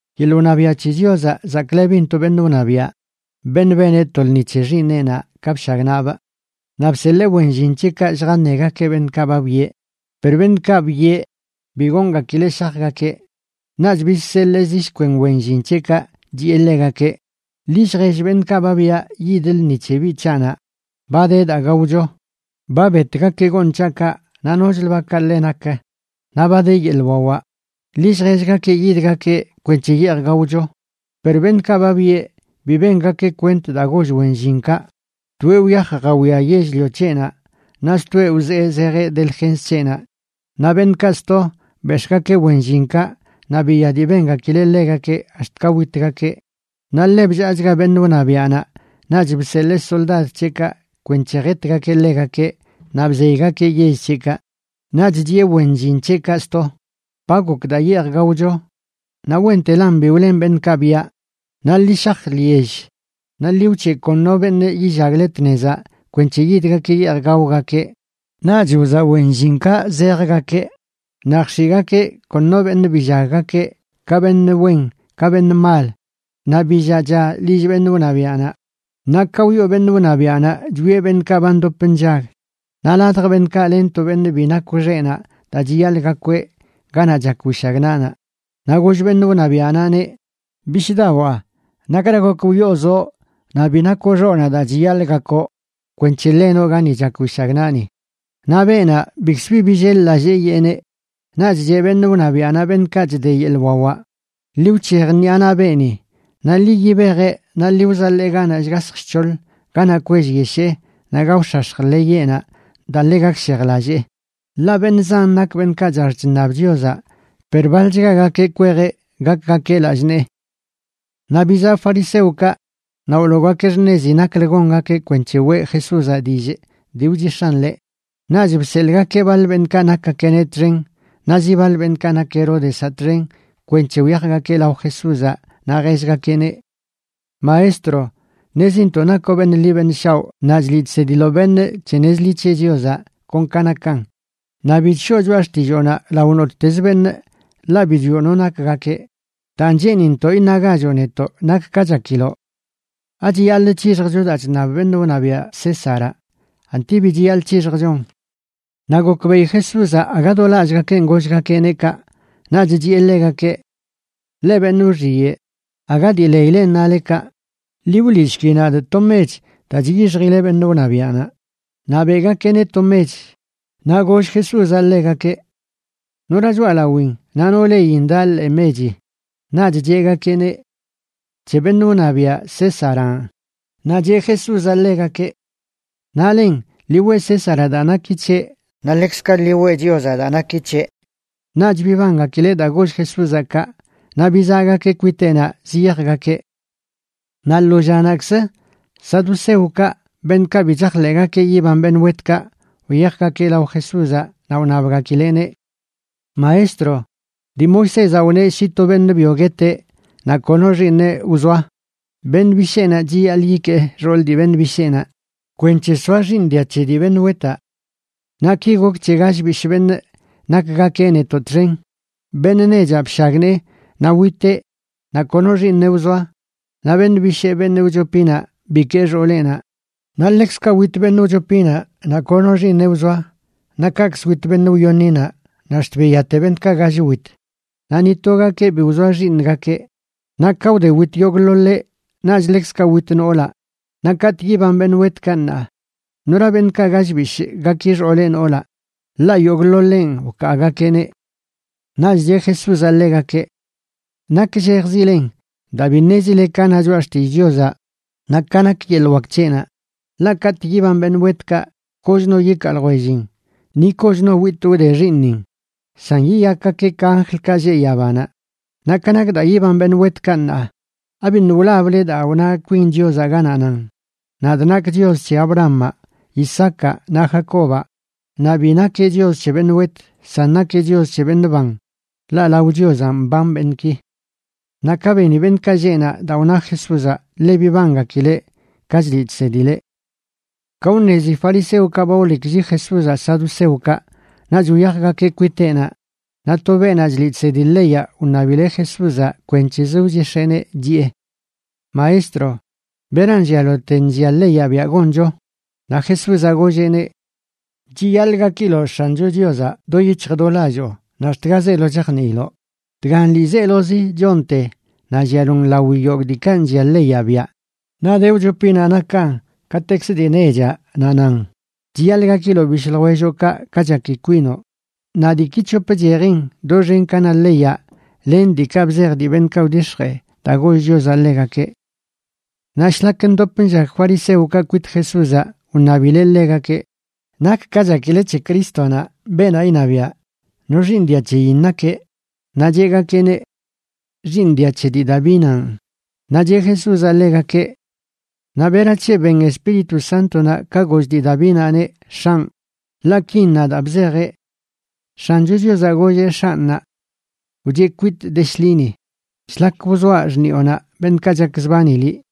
―Yeḻꞌ wṉabiaꞌ c̱he Chiozaꞌ chzaklebin to beṉꞌ wṉabiaꞌ, beṉꞌ beneꞌ to lṉi c̱he xiiṉeꞌnaꞌ ka bshagnaꞌbꞌ. Naꞌ bseḻee wen llin c̱heꞌkaꞌ lljaṉegakeꞌ beṉꞌkaꞌ ba byeꞌ, per beṉꞌkaꞌ byeꞌ bi goongakileꞌ shajgakeꞌ. Naꞌch bizseḻee zi shkwen wen llin c̱heꞌkaꞌ chiꞌe ḻegakeꞌ: “Ḻi lljell beṉꞌkaꞌ ba byaꞌ yid lṉi c̱he biꞌ c̱haꞌnaꞌ ba de daa gaocho. Ba betgakeꞌ gooṉ c̱haꞌkaꞌ naꞌ nochlə bakaꞌ ḻe nak, naꞌ ba de yeḻꞌ wawaꞌ. Ḻi lljellgakeꞌ yidgakeꞌ kwenc̱he yeej gaocho.” Per beṉꞌkaꞌ ba byeꞌ bi bengakeꞌ kwent daa goll wen llinkaꞌ. Toeꞌ wyaj jawiaꞌ yell-lio c̱heꞌnaꞌ naꞌ stoeꞌ wzee zejeꞌ delgens c̱heꞌnaꞌ. Naꞌ beṉꞌkaꞌ sto bex̱ꞌgakeꞌ wen llinkaꞌ naꞌ biya dii bengakileꞌ ḻegakeꞌ ax̱t ka witgakeꞌ. Naꞌ ḻe bllaachga beṉꞌ wṉabiaꞌnaꞌ, naꞌch bseḻee soldad c̱heꞌkaꞌ kwenc̱he jetgakeꞌ ḻegakeꞌ naꞌ bzeygakeꞌ yell c̱heꞌkaꞌ. Naꞌch chiꞌe wen llin c̱heꞌkaꞌ sto: “Ba gok daa yeej gaocho, naꞌ wentelan bi wlen beṉꞌkaꞌ byaꞌ. Naꞌ ḻi shaj lyell naꞌ ḻi wc̱heꞌ kon no beṉꞌ yillagle tnezaꞌ kwenc̱he yidgakeꞌ yeej gaogakeꞌ.” Naꞌch wzaꞌ wen llinkaꞌ zejgakeꞌ, naꞌ jx̱iꞌgakeꞌ kon no beṉꞌ billaggakeꞌ, ka beṉꞌ wen ka beṉꞌ mal. Naꞌ billaꞌcha lill beṉꞌ wṉabiaꞌnaꞌ. ’Naꞌ ka wyoo beṉꞌ wṉabiaꞌnaꞌ chwieꞌ beṉꞌkaꞌ ba ndop nllag, naꞌ ladj beṉꞌkaꞌ len to beṉꞌ bi nakw xeꞌnaꞌ daa chiyaḻꞌ gakweꞌ ganaꞌ chak wishagnaꞌnaꞌ. Naꞌ goll beṉꞌ wṉabiaꞌnaꞌneꞌ: “Bishꞌdawaa, ¿nakra gok wyoozoꞌ naꞌ bi nakw xoꞌnaꞌ daa chiyaḻꞌ gakoꞌ kwenc̱he ḻenoꞌ gani chak wishagnaꞌni?” Naꞌ beenaꞌ bikzə bi billel-lallee yeeneꞌ. Naꞌch cheꞌ beṉꞌ wṉabiaꞌnaꞌ beṉꞌkaꞌ chde yeḻꞌ wawaꞌ: “Ḻi wc̱hej ṉiꞌa naꞌ beeni naꞌ ḻi yibejeꞌ naꞌ ḻi wzaḻee ganaꞌ shgasj shc̱hoḻ, ganaꞌ kwellyeshee naꞌ gaox̱ax̱j ḻeyeꞌnaꞌ daa ḻe gakshejlallee.” Ḻaꞌ beṉꞌ zan nak beṉꞌkaꞌ chax chṉab Chiozaꞌ, per baḻchgagakeꞌ kwejeꞌ gakgakeꞌ lallꞌ nee. Naꞌ bizaꞌ fariseokaꞌ, naꞌ wloogakeꞌ xṉezi naklə gongakeꞌ kwenc̱he weꞌ Jesúzaꞌ dillꞌ dii wchix̱aꞌn ḻeꞌ. Naꞌch bseḻꞌgakeꞌ baḻ beṉꞌkaꞌ nakgakeꞌneꞌ txen naꞌ zi baḻ beṉꞌkaꞌ nak Heródezaꞌ txen kwenc̱he wyajgakeꞌ lao Jesúzaꞌ naꞌ jellgakeꞌneꞌ: ―Maestro, ṉezintoꞌ nakoꞌ beṉꞌ ḻi beṉꞌ shaoꞌ naꞌ chliꞌ chsediloꞌ beṉꞌ c̱he nez ḻi c̱he Chiozaꞌ kon ka nakan, naꞌ bi chshoo choꞌa xtilloonaꞌ lao nottezə beṉꞌ, ḻaꞌ bi chwioꞌ no nakgakeꞌ. Daan cheenintoꞌ iṉagachoꞌ netoꞌ nak ka chakiloꞌ: ¿Achiyaḻꞌ c̱hixjcho daa chṉab beṉꞌ wṉabiaꞌ Césaraꞌ, anti bi chiyaḻꞌ c̱hixjchon? Naꞌ gokbeꞌi Jesúzaꞌ aga do lallꞌgakenꞌ gollgakeꞌneꞌ kaꞌ, naꞌch chiꞌe ḻegakeꞌ: ―Leꞌ beṉꞌ wxiyeꞌ, aga dii leilen nale kaꞌ. Ḻi wliꞌshki nadꞌ to mech daa chyixjile beṉꞌ wṉabiaꞌnaꞌ. Naꞌ beꞌgakeꞌneꞌ to mech. Naꞌ goll Jesúzaꞌ ḻegakeꞌ: ―¿Nora choꞌalawin naꞌ no leyin daꞌ ḻee mechi? Naꞌch cheꞌgakeꞌneꞌ: ―C̱he beṉꞌ wṉabiaꞌ, Césaranꞌ. Naꞌ cheꞌ Jesúzaꞌ ḻegakeꞌ: ―Naꞌlen, ḻi weꞌ Césaraꞌ daa naki c̱heꞌ, naꞌ ḻekzkaꞌ ḻi weꞌ Chiozaꞌ daa naki c̱heꞌ. Naꞌch bibangakileꞌ daa goll Jesúzaꞌ kaꞌ. Naꞌ bizaꞌgakeꞌ kwiteꞌnaꞌ ziyajgakeꞌ. Naꞌ lo llanaꞌkzə saduceokaꞌ, beṉꞌkaꞌ bi chajḻeꞌgakeꞌ yiban beṉꞌ wetkaꞌ, wyajgakeꞌ lao Jesúzaꞌ, naꞌ wṉabgakileꞌneꞌ: ―Maestro, dii Moisézaꞌ wneꞌ shi to beṉꞌ byo gueteꞌ naꞌ kono xiiṉeꞌ wzoa, beṉꞌ bisheenaꞌ chiyaḻꞌ yikee xool dii beṉꞌ bisheenaꞌ kwenc̱he soa xiiṉ dia c̱he dii beṉꞌ wetaꞌ. Naꞌ ki gok c̱he gall bishꞌ beṉꞌ nakgakeꞌ netoꞌ txen. Beṉꞌ nechaꞌ bshagnee, naꞌ witeꞌ naꞌ kono xiiṉeꞌ wzoa, naꞌ beṉꞌ bishee, beṉꞌ wchopinaꞌ, bikee xooleꞌnaꞌ. Naꞌ ḻekzkaꞌ wit beṉꞌ wchopinaꞌ naꞌ kono xiiṉeꞌ wzoa. Naꞌ kaꞌkzə wit beṉꞌ wyoṉinaꞌ naꞌ ax̱t biyate beṉꞌkaꞌ gall wit. Naꞌ ni togakeꞌ bi wzoa xiiṉgakeꞌ. Naꞌ ka wde wit yogꞌḻoḻeꞌ naꞌch ḻekzkaꞌ wit noolaꞌ. Naꞌ katꞌ yiban beṉꞌ wetkaꞌ, ṉaa, ¿nora beṉꞌkaꞌ gall bishꞌ gaki xooleꞌ noolaꞌ? ḻaꞌ yogꞌḻoḻenꞌ wkaagakeꞌneꞌ. Naꞌch cheꞌ Jesúzaꞌ ḻegakeꞌ: ―Nakllejzilen daa bi ṉezile ka na Choꞌa Xtillꞌ Chiozaꞌ, naꞌ ka nak yeḻꞌ wak c̱heꞌnaꞌ. Ḻaꞌ katꞌ yiban beṉꞌ wetkaꞌ, koch no yikaa ljwellin, ni koch no witꞌ wde xiiṉin, san yiyakgakeꞌ ka anjlkaꞌ lleꞌ yabanaꞌ. Naꞌ ka nak daa yiban beṉꞌ wetkaꞌ, ṉaa, ¿abiṉꞌ wlable daa wna kwin Chiozaꞌ, ganaꞌ nan: “Nad nakꞌ Chios c̱he Abrahamaꞌ, Isaacaꞌ naꞌ Jacobaꞌ”? Naꞌ bi nakeꞌ Chios c̱he beṉꞌ wet, san nakeꞌ Chios c̱he beṉꞌ ban, ḻaꞌ lao Chiozaꞌ mban beṉꞌki. Naꞌ ka beni beṉꞌkaꞌ lleꞌ naꞌ daa wna Jesúzaꞌ, ḻe bibangakileꞌ ka chliꞌ chsedileꞌ. Ka wṉezi fariseokaꞌ ba wleklli Jesúzaꞌ saduceokaꞌ, naꞌch wyajgakeꞌ kwiteꞌnaꞌ. Naꞌ to beenaꞌ chliꞌ chsedi leyaꞌ wṉabileꞌ Jesúzaꞌ kwenc̱hezə wchix̱eeneꞌ, chiꞌe: ―Maestro, ¿beran llialote nllia leyaꞌ biaꞌ goncho? Naꞌ Jesúzaꞌ golleꞌneꞌ: ―“Chiyaḻꞌ gakiloꞌ X̱ancho Chiozaꞌ do yic̱hj do lalloo naꞌ ax̱t ga zeelo chajniiloꞌ.” Dgan ḻiizelozi chonte naꞌ llialon lawi yogꞌ diikaꞌ nllia leyaꞌ biaꞌ. Naꞌ de wchopinaꞌ nakan katekzə dii nechaꞌ, naꞌ nan: “Chiyaḻꞌ gakiloꞌ bishꞌ ljwelloꞌkaꞌ ka chaki kwinoꞌ.” Naꞌ diiki c̱hop chejin doxen ka na leyaꞌ len diikaꞌ bzej dii beṉꞌkaꞌ wdix̱jee daa goll Chiozaꞌ ḻegakeꞌ. Naꞌ shlak ndop nllag fariseokaꞌ kwit Jesúzaꞌ wṉabileꞌ ḻegakeꞌ: ―¿Nak ka chakile c̱he Crístonaꞌ, beenaꞌ iṉabiaꞌ? ¿No xiiṉ dia c̱heyin nakeꞌ? Naꞌ cheꞌgakeꞌneꞌ: ―Xiiṉ dia c̱he dii Davinanꞌ. Naꞌ cheꞌ Jesúzaꞌ ḻegakeꞌ: ―Naꞌ ¿berac̱he ben Espíritu Sántonaꞌ ka goll dii Davinaꞌneꞌ: “X̱anꞌ”? Ḻaꞌ kin na daa bzejeꞌ: X̱ancho Chiozaꞌ golleꞌ X̱anꞌnaꞌ: “Wcheꞌ kwitꞌ de shḻini, shlak wzoaꞌ xṉiꞌonaꞌ beṉꞌkaꞌ chakzbani liꞌ.”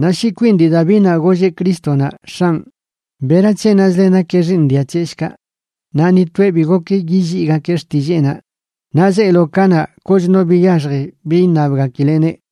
Naꞌ shi kwin dii Davinaꞌ golleꞌ Crístonaꞌ: “X̱anꞌ”, ¿berac̱he nazle nakeꞌ xiiṉ dia c̱heꞌ, shkaꞌ? Naꞌ ni toeꞌ bi gok yilliigakeꞌ xtilleenaꞌ. Naꞌ zeelo kanaꞌ koch no biyaxji bi iṉabgakileꞌneꞌ.